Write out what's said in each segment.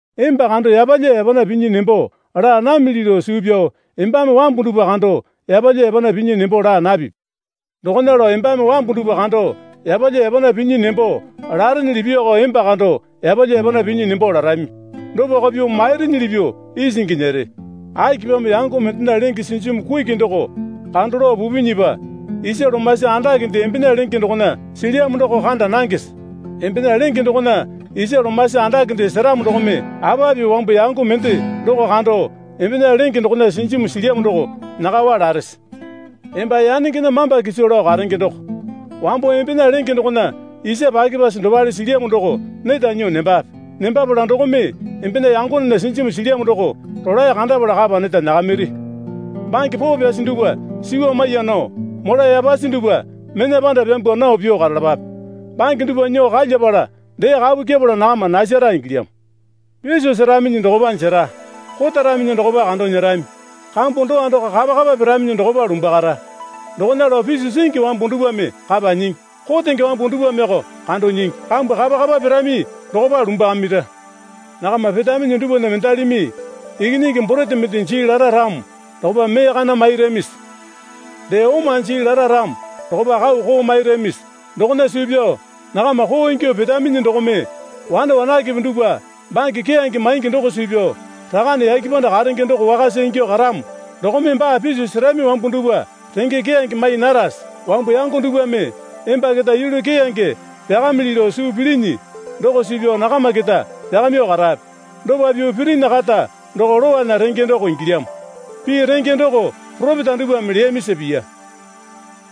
Emba kando yapalya yapana pinyi nembo laa namili lao suu pyao embame wambu dupwa kando yapalya yapana pinyi nembo laa napipi. Dokona lao embame wambu dupwa kando yapalya yapana pinyi nembo larenyili pyuoko emba kando yapalya yapana pinyi nembo larami. Dopako pyuo mairinyili pyuo isingi nyere. Akipamo yango mendena lenge sinjimu kuki doko kando lao pupinyipa isa lomasi andakende embena lenge dokona silyamo doko kanda nangese? Embena lenge dokona isa lomasi andakende seramo dokome apa pyuo wambu yango mende doko kando, Embena lenge dokona sinjimu silyamo doko nyakawa larese? Emba yanengena mamba kiso lao karenge doko. Wambo embena lenge dokona isa pyakepasi dopale silyamo doko neta nyuo nembape. Nembapala dokome embena yangonena sinjimu silyamo doko rolae kandapala kapa neta nyakamiri. Bange poo pyasi dupwa suwa maiya nao mola yapasi dupwa mena panda pyambwa nao pyuo karalapape. Bange dupwa nyuo kalyapala dee kapu kyepala nakama nasara ingilyamo. Piso seraminyi dokopa jera. Kotaraminyi dokopa kando nyerami. Kambu dowa doko kapakapa piraminyi dokopa lumbwakara. Dokona lao piso singi wambu dupwame kapa nyingi, kotenge wambu dupwameko kando nyingi, kambu kapakapa pirami dokopa lumbwakamira. Nakama petaminyi dupwana mendalimi ikinyingi borete mende jii lara ramo dokopa mee kana mairamisi? Dee oma jii lara ramo dokopa kau koo mairamisi? Dokona suu pyao nakama koo ingyuo petaminyi dokome wane wanakepe dupwa bange keyange maingi doko suu pyao Rakane yake panda karenge doko wakasa ingyuo karamo dokome baa piso serami wambu dupwa renge keyange mai narase? Wambu yango dupwame emba keta yulu keyange pyakamili lao suu pilinyi doko suu pyao nakama keta pyakamyuo karape. Dopa pyuo pirinyi kata doko lowana renge doko ingilyamo, Pii renge doko poropeta dupwame leyamisa piya.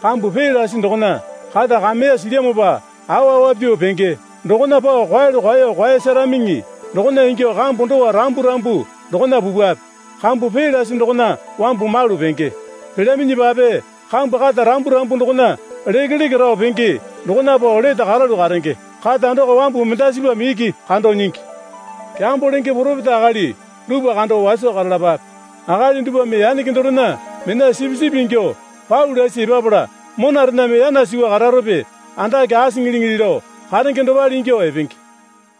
Kambu pee lasi dokona kata kameya silyamopa awa awa pyuo penge dokona pao kwaeyalu kwaeyo kwaeyasaramiŋi. Dokona ingyuo kambu dowa rambu rambu dokona pupwape. Kambu pee lasi dokona wambu malu penge. Pelyaminyipape kambu kata rambu rambu dokona lekeleke rao penge dokona pao lete karalu karenge. Kata doko wambu mendasipame iki kando nyingi. Kyambo lenge poropeta akali dupwa kando waso karalapape. Akali dupwame yanenge dorena mena sipisipi ingyuo pau lasi epapala monarename yana suwa kararope andake asiŋiliŋili lao karenge dopale ingyuo epenge.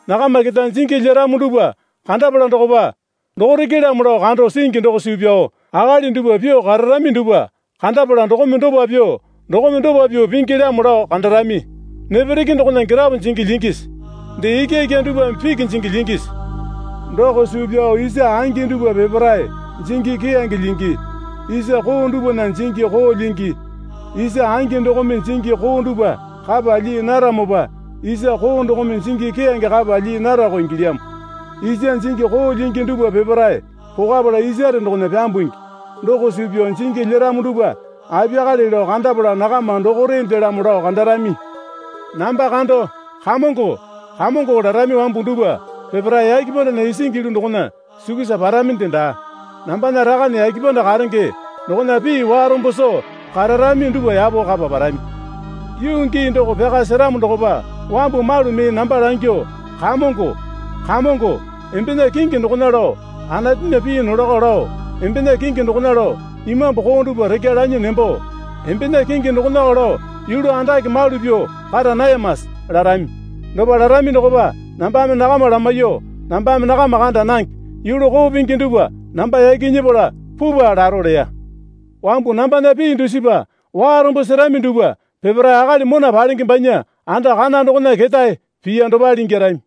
Nakama keta jingi lyeramo dupwa kandapala dokopa dokorekelamo lao kando singi doko suu pyao akali dupwa pyuo kararami dupwa kandapala dokome dopa pyuo dokome dopa pyuo pingilyamo lao kandarami. Nepereke dokona girapo jingi lyingisi? Dee ikyaikya dupwame piki jingi lyingisi? Doko suu pyao isa angi dupwa peparae jingi keyange lyingi, isa koo dupwana jingi koo lyingi. Isa angi dokome jingi koo dupwa kapa lyii naramopa isa koo dokome jingi keyange kapa lyii narako ingilyamo. Isa jingi koo lyingi dupwa peparae pokapala isare dokona pyambungi. Doko suu pyao jingi lyeramo dupwa apiyakale lao kandapala nakama dokorendelamo lao kandarami. Namba kando, Kamongo, Kamongo larami wambu dupwa peparae yake pandana isingi yulu dokona sukusa paraminde daa. Nambana Rakane yake panda karenge dokona pii warombo soo kararami dupwa yapo kapa parami. Yuu gii doko pyaka seramo dokopa wambu malumi namba langyuo, Kamongo, Kamongo, embena kingi dokona lao Anatunya pii nolako lao, embena kingi dokona lao imambu koo dupwa rekya lanyi nembo, embena kingi dokonako lao yulu andake malu pyuo kara nayamase? larami. Dopa larami dokopa nambame nakama lamaiyuo, Nambame nakama kanda nange. Yulu koo pingi dupwa namba yaki nyepala pupwa, laro leya. Wambu nambana pii dusipa warombo serami dupwa peparae akali mona palenge banya anda kana dokona ketae piya dopale ingyarami.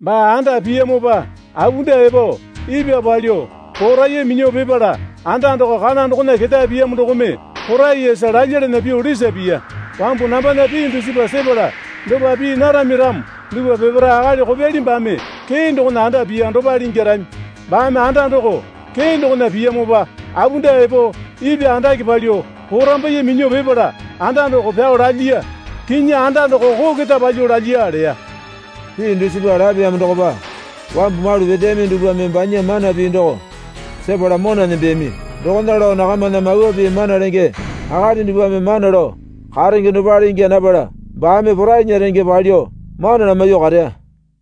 Baa anda piyamopa apunda epo ipwa palyuo poraiya minyuo pipala anda doko kana dokona ketae piyamo dokome poraiyasa lalyalana pyuo lisa piya. Wambu nambana pii dusipa sepala dopa pii narami ramo dupwa peparae akali kopyali baame kee dokona anda piya dopale ingyarami. Baame anda doko kee dokona piyamopa apunda epo, ipwa andake palyuo, porambaiye minyuo pipala anda doko pyao lalyiya. Kinyi anda doko koo keta palyuo lalyiya leya. Pii dusipa lapeyamo dokopa wambu malu peteyami dupwame banya Mana Pii doko sepala mona nembeyami. Dokona lao nakamana mawa pii mana lenge akali dupwame mana lao karenge dopale ingya napala baame porainya renge palyuo mana lamaiyuo kareya.